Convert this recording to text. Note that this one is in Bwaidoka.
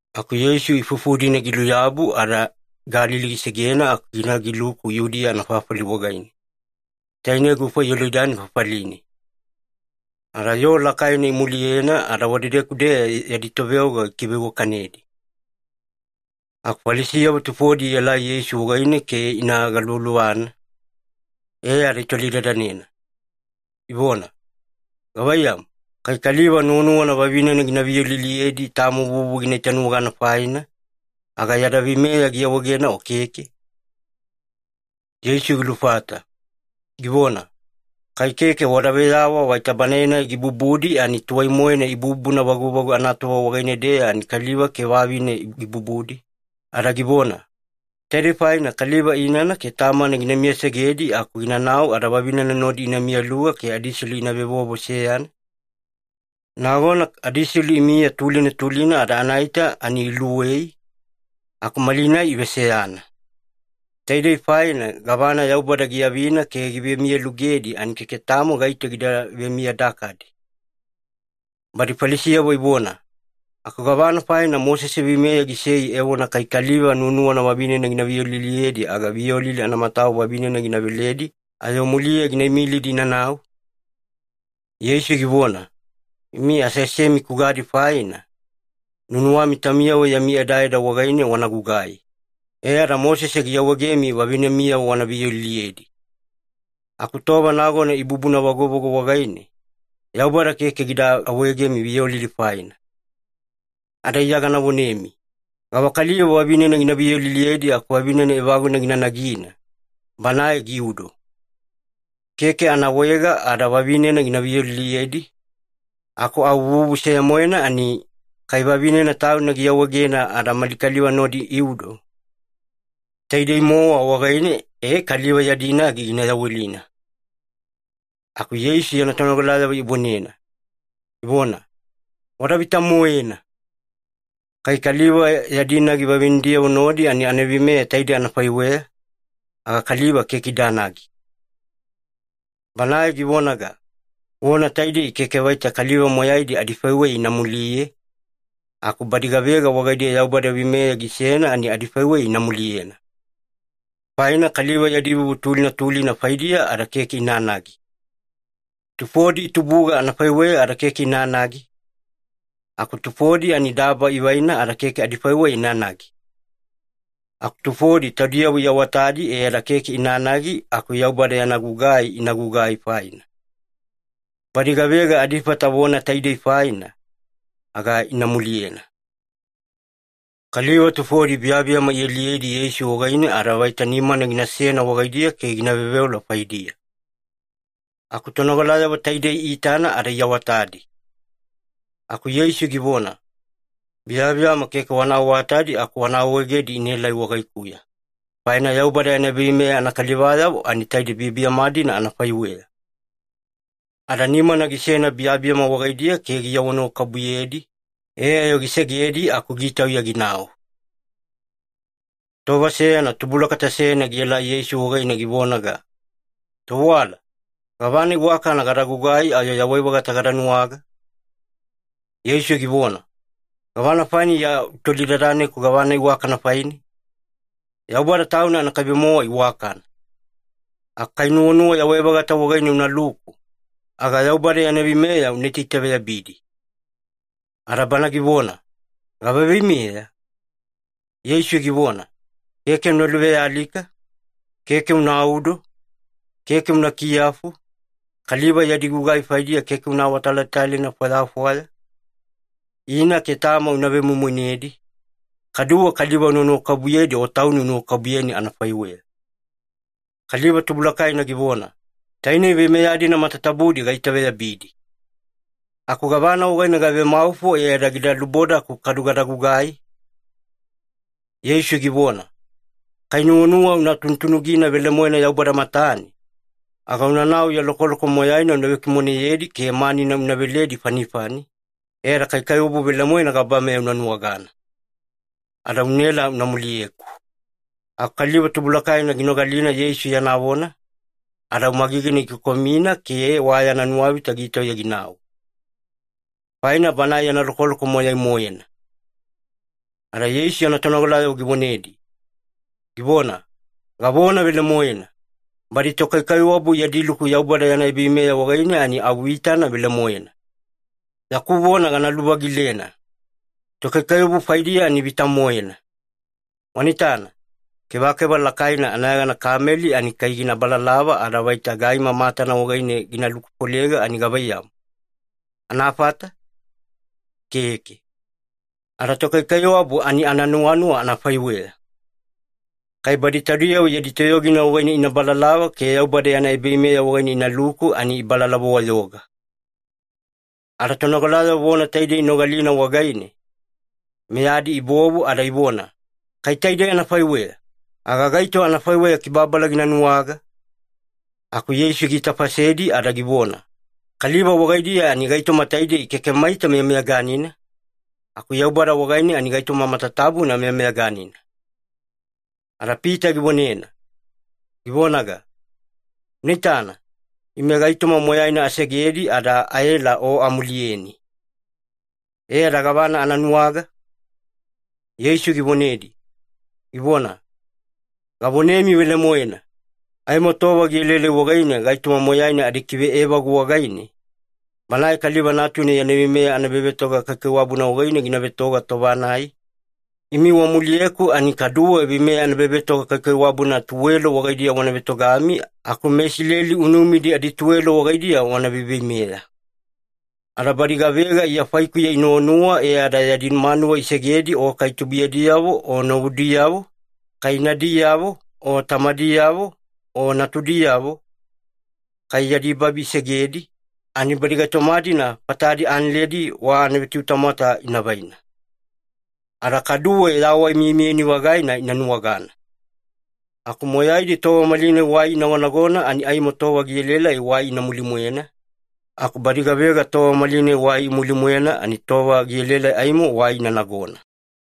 Aku Yeisu ifufu-dina giluyabu ada Galili gisegena aku gina giluku Yudiya anafafali wagaine. Tainei gufa Yolidani fafaline. Ada yoo lakaina imuliyena ada wadedeku-deya yadi toveoga gikiveiwakanedi. Aku Falisiyavo tufodi ielai Yeisu wagaine ke ina galuvaluvana, e ada itolidadanena, ivona, “Gavaiyamu, kai kaliva nuwanuwana vavinena gina viyoliliyedi tamo vuvu gina itanuwagana faina, aga yada veimeya giawaegena o keke?” Yeisu gilufata, givona, “Kai keke wada veyawa vaita Banae-nai gibubudi ani tuwai-moena ibubuna vaguvagu anatova wagaine-deya ani kaliva ke vavine gibubudi, ada givona, ‘Taidei faina kaliva inana ke tamana gina miyasegedi aku ginanau ada vavinena nodi ina miyaluga ke adiselu ina vevovo seyana’? Nagona adiselu imiya tulina tulina ada anaita ani iluwei, aku malinai iveseyana. Taidei faina gavana Yaubada giavina ke givemiyalugedi ani keke tamo gaito gida vemiyadakadi.” Badi Falisiyavo ivona, “Aku gavana faina Mosese veimeya gisei evona kai kaliva nuwanuwana vavinena gina viyoliliyedi, aga viyolili anamatawa vavinena gina veledi, ayo muliya gina imilidi inanau?” Yeisu givona, “Imi aseasemi kugadi faina, nuwanuwami taumiyavo yami edaeda wagaine wana gugai. E ada Mosese giawaegemi vavinemiyavo wana viyoliliyedi. Aku tova nagona ibubuna vaguvagu wagaine, Yaubada keke gida awaegemi viyolili faina. Ada Iya gana vonemi, gavakaliva vavinena gina viyoliliyedi aku vavine evaguna gina nagina, banae giudo. Keke anaawaega ada vavinena gina viyoliliyedi, aku au vuvu seya-moena ani, kai vavinena tauna giawaegena ada mali kaliva nodi iudo. Taidei-mowa wagaine e kaliva yadi nagi gina yawelina.” Aku Yeisu yana tonogalayavo ivonena, ivona, “Wada vita-moena! Kai kaliva yadi nagi vavinediyavo nodi ani anaveimeya taide anafaiweya, aga kaliva keke idanagi.” Banae givonaga, “Vona taidei keke vaita kaliva moyaidi adifaiweya ina muliye, aku badi gavega wagaidiya Yaubada veimeya gisena ani adifaiweya ina muliyena. Faina kaliva yadi vuvu tulina tulina faidiya ada keke inanagi. Tufodi itubuga anafaiweya ada keke inanagi, aku tufodi ani daba ivaina ada keke adifaiweya inanagi. Aku tufodi taudiyavo iawatadi e ada keke inanagi aku Yaubada yana gugai ina gugai faina. Badi gavega adifata vona taidei faina, aga ina muliyena.” Kaliva tufodi biyabiyama ialiyedi Yeisu wagaine ada vaita nimana ginasena wagaidiya ke gina veoveola faidiya. Aku tonogalayavo taidei iitana ada iawatadi. Aku Yeisu givona, “Biyabiyama keke wana awatadi aku wana awaegedi inaelai wagaikuya, faina Yaubada yana ebaveimeya anakalivayavo ani taide biyabiyama-dina anafaiweya.” Ada nimana gisena biyabiyama wagaidiya ke giawanuwakabubuyedi, e ayo gisegedi aku gitauya ginau. Tova seyana tubulakata seyana gielai Yeisu wagaine givonaga, “Tovewala, gavana iwakana gada gugai ayo yawai-vagata gada nuwaga?” Yeisu givona, “Gavana faina Iya utolidadaneku gavana iwakana faine? Yaubada Tauna anakaibe-mowa iwakana. Aku kai nuwanuwa yawai-vagata wagaine unaluku, aga Yaubada yana veimeya una itaitaveyabidi.” Ada bana givona, “Gava veimeya?” Yeisu givona, “Keke una luvealika, keke unaudo, keke una kiyafu, kaliva yadi gugai faidiya keke una awatalatalaina fwayafwaya, ina ke tama una vemoimoinedi, kaduwe kaliva una nuwakabubuyedi o tauni unuwakabubuyeni anafaiweya.” Kaliva tubulakaina givona, “Tainei veimeya-dina matatabudi gaitaveyabidi. Aku gavana wagaine gavemaufo e ada gida lubodaku kadu gada gugai?” Yeisu givona, “Kai nuwanuwa una tunutunugina velemoena Yaubada matane, aga unanau ya lokoloko moyaina una vekimoneyedi ke manina una veledi fanifani, e ada kaikaiwabu velemoena gabameya una nuwagana. Ada unaela una muliyeku.” Aku kaliva tubulakaina ginogalina Yeisu yana vona, ada au magigina gikokomina ke wa yana nuwavita gitauya ginau. Faina banae yana lokoloko moyai-moena. Ada Yeisu yana tonogalayavo givonedi, givona, “Gavona velemoena, badi tokaikaiwabu yadi luku Yaubada yana ebaveimeya wagaine ani au vitana velemoena. Yaku vona gana luvagilena. Tokaikaiwabu faidiya ani vita-moena. Wana itana, kevakeva lakaina anayegana kameli ani kai gina balalava ada vaita gaima matana wagaine gina lukufolega ani gavaiyamu, anafata? Keke. Ada tokaikaiwabu ani ananuwanuwa anafaiweya. Kai badi taudiyavo yadi toyogina wagaine ina balalava ke Yaubada yana ebaveimeya wagaine inaluku, ani ibalalava-wayoga.” Ada tonogalayavo vona taidei inogalina wagaine, meyadi ibovu ada ivona, “Kai taidei anafaiweya, aga gaito anafaiweya kibababala gina nuwaga?” Aku Yeisu giitafasedi ada givona, “Kaliva wagaidiya ani gaitoma taidei keke maita meyameyaganina, aku Yaubada wagaine ani gaitoma matatabuna meyameyaganina.” Ada Pita givonena, givonaga, “Una itana, ime gaitoma moyaina asegedi ada aela O amuliyeni. E ada gavana ana nuwaga?” Yeisu givonedi, givona, “Gavonemi velemoena, aimo tova gielaelai wagaine gaitoma moyaina adikiveevagu wagaine, Banae Kaliva Natuna yana veimeya anaebavetoga kaikaiwabuna wagaine gina vetoga tova-nai, imi wamuliyeku ani kaduwe veimeya anaebavetoga kaikaiwabuna tuwelo wagaidiya wana vetogami aku meIsileli unumidi adituwelo wagaidiya wana veiveimeya. Ada badi gavega Iya faikuya inuwanuwa e ada yadi manuwa isegedi o kai tubuiyadiyavo o novudiyavo, kai inadiyavo o tamadiyavo o natudiyavo, kai yadi babi isegedi, ani badi gaitoma-dina fatadi analedi wa anavetutamwata inavaina. Ada kaduwe yawai miyamiyani-vagaina ina nuwagana. Aku moyaidi tova malinai wai inagonagona ani aimo tova gielaelai wai ina muline-mwena, aku badi gavega tova malinai wai imuline-mwena ani tova gielaelai aimo wai ina nagona.”